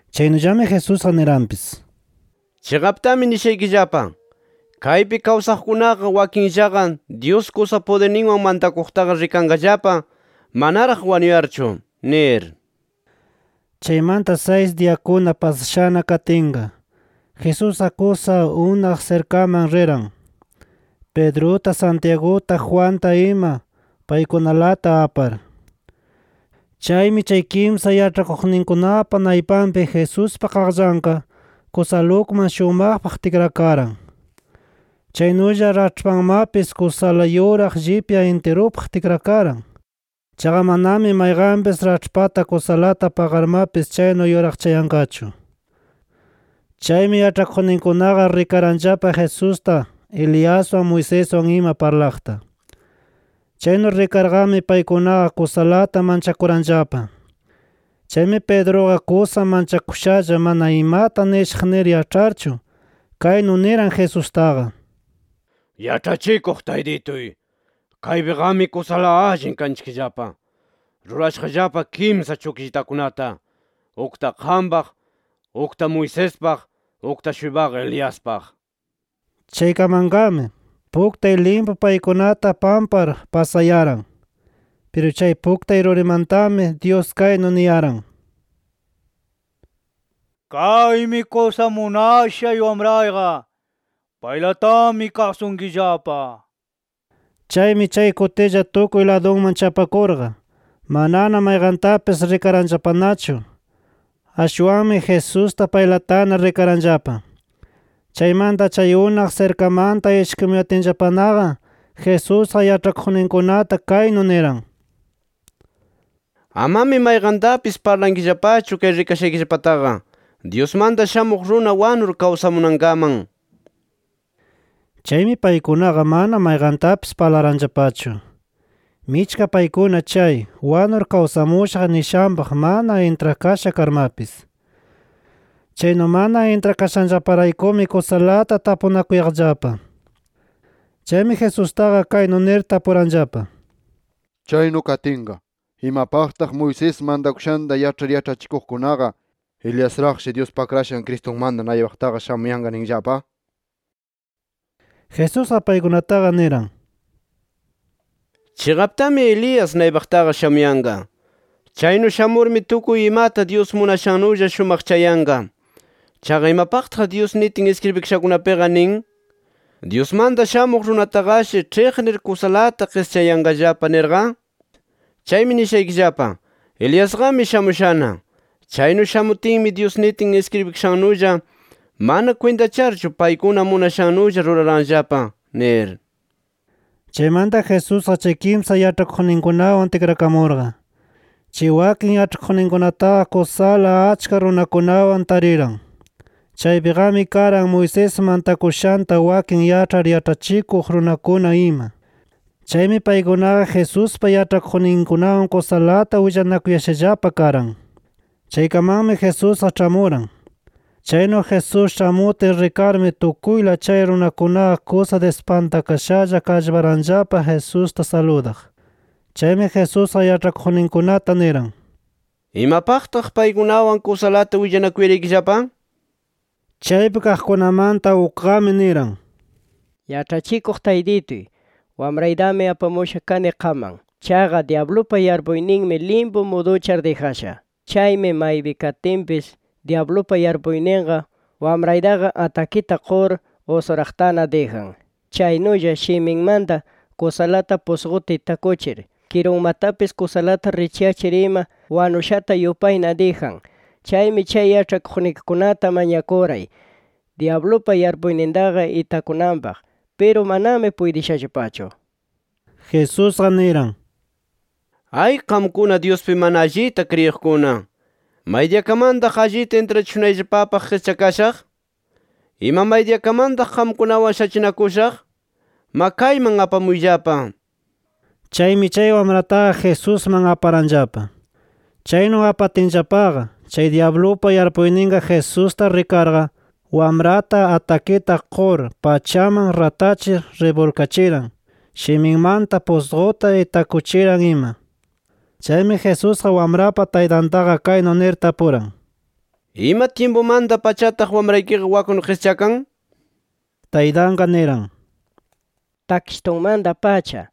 Chaynullami Jesusqa niranpis: —Chiqaptami nishaykillapa: Kaypi kawsaqkunaqa wakinllaqa Dyus kusa pudirninwan mantakuqtaqa rikanqallapa manaraq wanuyarchu nir. Chaymanta saysi diyakuna pasashana katinqa, Jesusqa kusa unaq sirkaman riran, Pedruta, Santiaguta, Juanta ima, paykunalata apar. Chaymi chay kimsa yaĉhakuqninkunapa naypanpi Jesuspa qaqllanqa, kusala ukman shumaqpaq tikrakaran. Chaynulla raĉhpanmapis kusala yuraq llipya intirupaq tikrakaran. Chaqa manami mayqanpis raĉhpata kusalata paqarmapis chaynu yuraqchayanqachu. Chaymi yaĉhakuqninkunaqa rikaranllapa Jesusta, Eliaswan, Moiseswan ima parlaqta. Chaynu rikarqami paykunaqa kusalata manchakuranllapa. Chaymi Pedruqa kusa manchakushalla mana imata nishaq nir yaĉharchu, kaynu niran Jesustaqa: —Yaĉhachikuq Taytituy, ¡kaypiqami kusala allin kanchikllapa! Rurashaqllapa kimsa chukllitakunata, ukta qampaq, ukta Moisespaq, ukta-shuypaqa Eliaspaq nir. Chaykamanqami, puktay limpu paykunata pampar pasayaran. Piru chay puktay rurimantami Dyus kaynu niyaran: “Kaymi kusa munashay Wamrayqa. ¡Paylatami kasunkillapa!” nir. Chaymi chay kutilla tukuy ladunman chapakurqa, manana mayqantapis rikaranllapanachu. Ashwanmi Jesusta paylatana rikaranllapa. Chaymanta chay unaq sirkamanta ishkimuyatinllapanaqa Jesusqa yaĉhakuqninkunata kaynu niran: —Amami mayqantapis parlankillapachu chay rikashaykillapataqa, Dyusmanta Shamuq Runa wanur kawsamunankaman nir. Chaymi paykunaqa mana mayqantapis parlaranllapachu, michka paykuna chay “Wanur kawsamushaq” nishanpaq mana intrakasha karmapis. Chaynu mana intrakashanllaparaykumi kusalata tapunakuyaqllapa. Chaymi Jesustaqa kaynu nir tapuranllapa: —Chaynu katinqa, ¿imapaqtaq Moisés mantakushanta yaĉhar yaĉhachikuqkunaqa, Eliasraqshi Dyuspa Akrashan Cristunmanta naypaqtaqa shamuyanqa ninllapa? nir. Jesusqa paykunataqa niran: —Chiqaptami Elías naypaqtaqa shamuyanqa. Chaynu shamurmi tukuy imata Dyus munashanulla shumaqchayanqa. Chaqa, ¿imapaqtaq Dyus nitin iskribikashakunapiqa nin: ‘Dyusmanta Shamuq Runataqashi ĉhiqnir kusalata qischayanqallapa?’ nirqa. Chaymi nishaykillapa: Eliasqami shamushana. Chaynu shamutinmi, Dyus nitin iskribikashannulla mana kwintacharchu paykuna munashannulla ruraranllapa nir. Chaymanta Jesusqa chay kimsa yaĉhakuqninwan tikrakamurqa, chay wakin yaĉhakuqninkunataqa kusala achka runakunawan tariran. Chaypiqami karan Moisés mantakushanta wakin yaĉhar yaĉhachikuq runakuna ima. Chaymi paykunaqa Jesuspa yaĉhakuqninkunawan kusalata willanakuyashallapa karan. Chaykamanmi Jesusqa ĉhamuran. Chaynu Jesús ĉhamutin rikarmi tukuyla chay runakunaqa kusa dispantakashalla kallparanllapa Jesusta saludaq. Chaymi Jesusqa yaĉhakuqninkunata niran: —¿Imapaqtaq paykunawan kusalata willanakuyaraykillapa? nir. Chaypi kaqkunamanta ukqami niran: —Yaĉhachikuq Taytituy, wamraytami apamusha kani qamman. Chaqa dyablupa yarpuyninmi limpu muduchar dijasha. Chaymi maypi katinpis dyablupa yarpuyninqa wamraytaqa atakita qur usuraqtana dijan. Chaynulla shiminmanta kusalata pusquta itakuchir, kirunmatapis kusalata richyachir ima wanushata yupayna dijan. Chaymi chay yaĉhakuqnikikunata mañakuray dyablupa yarpuynintaqa itakunanpaq. Piru manami puytishallapachu nir. Jesusqa niran: —¡Ay qamkuna Dyuspi mana allita kriyiqkuna! ¿Maydiyakamantaq allita intrachishunayllapapaq qischakashaq? ¿Ima maydiyakamantaq qamkunawan shachinakushaq? Ma, kayman apamuyllapa nir. Chaymi chay wamrataqa Jesusman aparanllapa. Chaynu apatinllapaqa, chay dyablupa yarpuyninqa Jesusta rikarqa, wamrata atakita qur pachaman ratachir ribulkachiran, shiminmanta pusquta itakuchiran ima. Chaymi Jesusqa wamrapa taytantaqa kaynu nir tapuran: —¿Ima tyimpumanta-pachataq wamraykiqa waknu qischakan? nir. Taytanqa niran: —Takshitunmanta-pacha.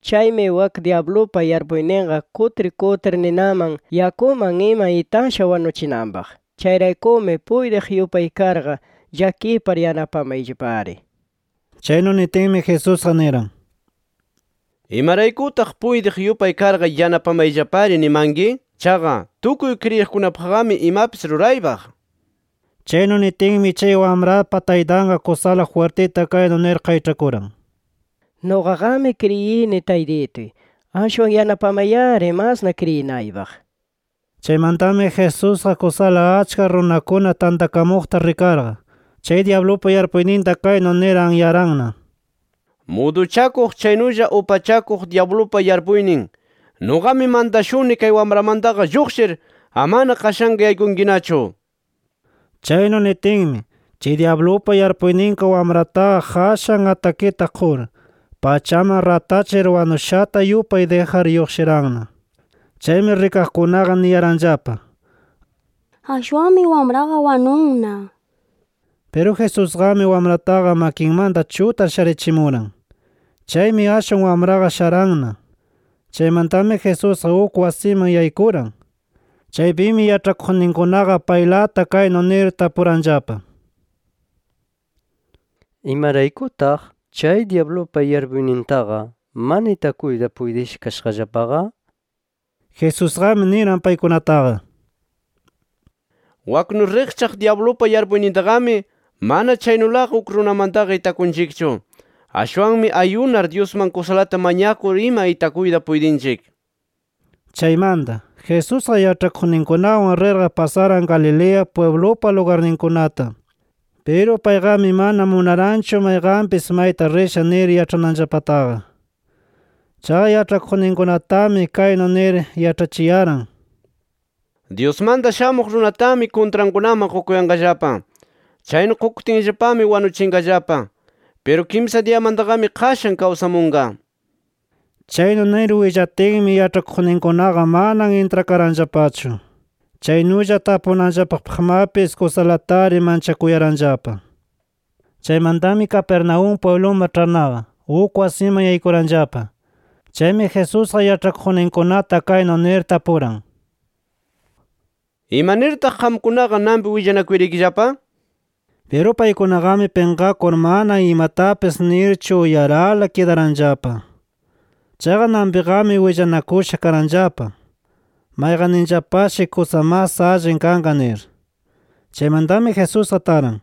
Chaymi wak dyablupa yarpuyninqa kutir kutir ninaman, yakuman ima itasha wanuchinanpaq. Chayraykumi puytiq yupay karqa, llakipar yanapamayllapari nir. Chaynu nitinmi Jesusqa niran: —¿Imaraykutaq puytiq yupay karqa yanapamayllapari nimanki? Chaqa tukuy kriyiqkunapaqqami imapis ruraypaq nir. Chaynu nitinmi chay wamrapa taytanqa kusala jwirtita kaynu nir qayĉhakuran: —Nuqaqami kriyini, Taytituy. Ashwan ¡yanapamay-ari masna kriyinaypaq! nir. Chaymantami Jesusqa kusala achka runakuna tantakamuqta rikarqa, chay dyablupa yarpuyninta kaynu nir anyaranna: —Muduchakuq chaynulla upachakuq dyablupa yarpuynin, nuqami mantashuni kay wamramantaqa lluqshir, amana qashanqa yaykunkinachu nir. Chaynu nitinmi, chay dyablupa yarpuyninqa wamrataqa qashan atakita qur, pachaman ratachir wanushata yupay dijar lluqshiranna. Chaymi rikaqkunaqa niyaranllapa: “Ashwanmi wamraqa wanunna” nir. Piru Jesusqami wamrataqa makinmanta chutar sharichimuran. Chaymi ashwan wamraqa sharanna. Chaymantami Jesusqa uk wasiman yaykuran. Chaypimi yaĉhakuqninkunaqa paylata kaynu nir tapuranllapa: —¿Imaraykutaq chay dyablupa yarpuynintaqa mana itakuyta puytisha kashaqllapaqa? nir. Jesusqami niran paykunataqa: —Waknu riqchaq dyablupa yarpuynintaqami mana chaynulaqa uk runamantaqa itakunchikchu. Ashwanmi [ayunar] Dyusman kusalata mañakur ima itakuyta puytinchik nir. Chaymanta, Jesusqa yaĉhakuqninkunawan rirqa pasaran Galilea pwiblupa lugarninkunata. Piru payqami mana munaranchu mayqanpis mayta risha nir yaĉhananllapataqa. Chaqa yaĉhakuqninkunatami kaynu nir yaĉhachiyaran: “Dyusmanta Shamuq Runatami kuntrankunaman qukuyanqallapa. Chaynu qukutinllapami wanuchinqallapa. Piru kimsa diyamantaqami qashan kawsamunqa” nir. Chaynu nir willatinmi yaĉhakuqninkunaqa mana intrakaranllapachu. Chaynulla tapunanllapapaqmapis kusalatari manchakuyaranllapa. Chaymantami Capernaúm pwibluman ĉharnaqa, uk wasiman yaykuranllapa. Chaymi Jesusqa yaĉhakuqninkunata kaynu nir tapuran: —¿Imanirtaq qamkunaqa nanpi willanakuyaraykillapa? nir. Piru paykunaqami pinqakur mana imatapis nirchu uyarala kidaranllapa. Chaqa nanpiqami willanakusha karanllapa, mayqanninllapashi kusa mas allin kanqa nir. Chaymantami Jesusqa taran.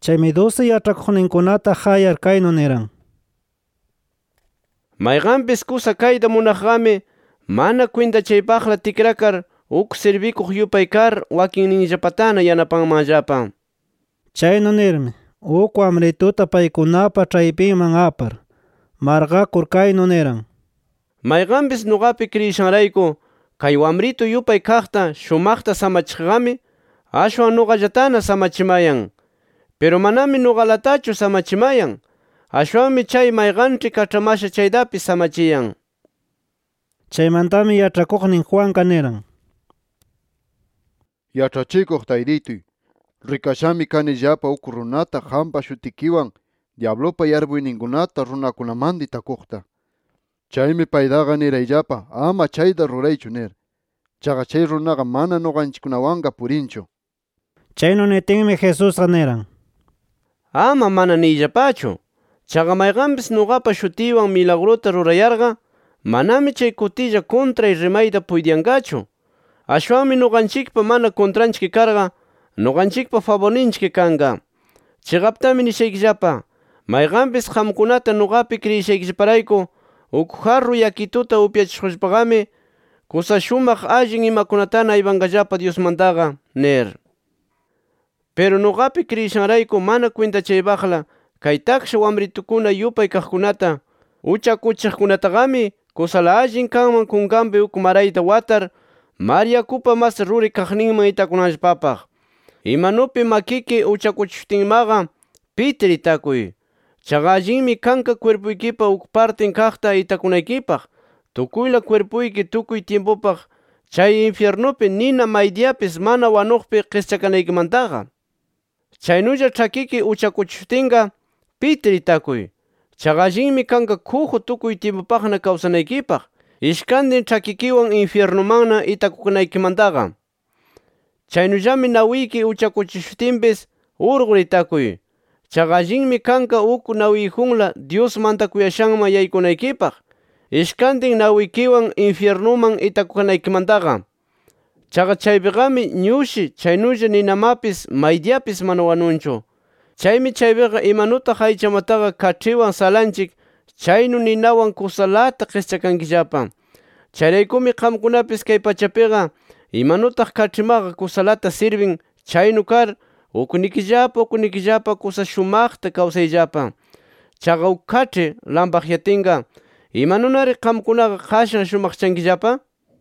Chaymi dusi yaĉhakuqninkunata qayar, kaynu niran: —Mayqanpis kusa kayta munaqqami mana kwintachaypaqla tikrakar, uk sirbikuq yupay kar wakinninllapatana yanapanmanllapa. Chaynu nirmi, uk wamrituta paykunapa ĉhaypinman apar, marqakur kaynu niran: —Mayqanpis nuqapi kriyishanrayku kay wamritu yupay kaqta, shumaqta samachiqqami, ashwan nuqallatana samachimayan. Piru manami nuqalatachu samachimayan, ashwanmi chay mayqanĉhi kaĉhamasha chaytapis samachiyan nir. Chaymantami yaĉhakuqnin Juanqa niran: —Yaĉhachikuq Taytituy rikashami kanillapa uk runata qampa shutikiwan dyablupa yarpuyninkunata runakunamanta itakuqta. Chaymi paytaqa nirayllapa ama chayta ruraychu nir. Chaqa chay runaqa mana nuqanchikkunawanqa purinchu. Chaynu nitinmi Jesusqa niran: —Ama ‘Mana’ niyllapachu. Chaqa mayqanpis nuqapa shutiywan milagruta rurayarqa, manami chay kutilla kuntray rimayta puytiyanqachu. Ashwanmi nuqanchikpa mana kuntranchik karqa, nuqanchikpa faburninchik kanqa. Chiqaptami nishaykillapa: Mayqanpis qamkunata nuqapi kriyishaykillaparayku uk jarru yakituta upyachishuqllapaqami, kusa shumaq allin imakunatana aypanqallapa Dyusmantaqa nir. Piru nuqapi kriyishanrayku mana kwintachaypaqla kay taksha wamrituykuna yupay kaqkunata uchakuchiqkunataqami, kusala allin kanman kunkanpi uk marayta watar, mar yakupa mas ruri kaqninman itakunanllapapaq. Imanupi makiki uchakuchishutinmaqa, pitir itakuy. Chaqa allinmi kanqa kwirpuykipa uk partin kaqta itakunaykipaq tukuyla kwirpuyki tukuy tyimpupaq chay infyirnupi nina maydiyapis mana wanuqpi qischakanaykimantaqa. Chaynulla ĉhakiki uchakuchishutinqa, pitir itakuy. Chaqa allinmi kanqa kuju, tukuy tyimpupaqna kawsanaykipaq, ishkantin ĉhakikiwan infyirnumanna itakukanaykimantaqa. Chaynullami nawiki uchakuchishutinpis, urqur itakuy. Chaqa allinmi kanqa uk nawiyjunla, Dyus mantakuyashanman yaykunaykipaq, ishkantin nawikiwan infyirnuman itakukanaykimantaqa. Chaqa chaypiqami ñushi chaynulla ninamapis maydiyapis mana wanunchu. Chaymi chaypiqa imanutaq aychamataqa kaĉhiwan salanchik chaynu ninawan kusalata qischakankillapa. Chayraykumi qamkunapis kay pachapiqa imanutaq kaĉhimaqa kusalata sirbin chaynu kar uknikillapa uknikillapa kusa shumaqta kawsayllapa. Chaqa uk kaĉhi lampaqyatinqa, ¿imanunari qamkunaqa qashan shumaqchankillapa?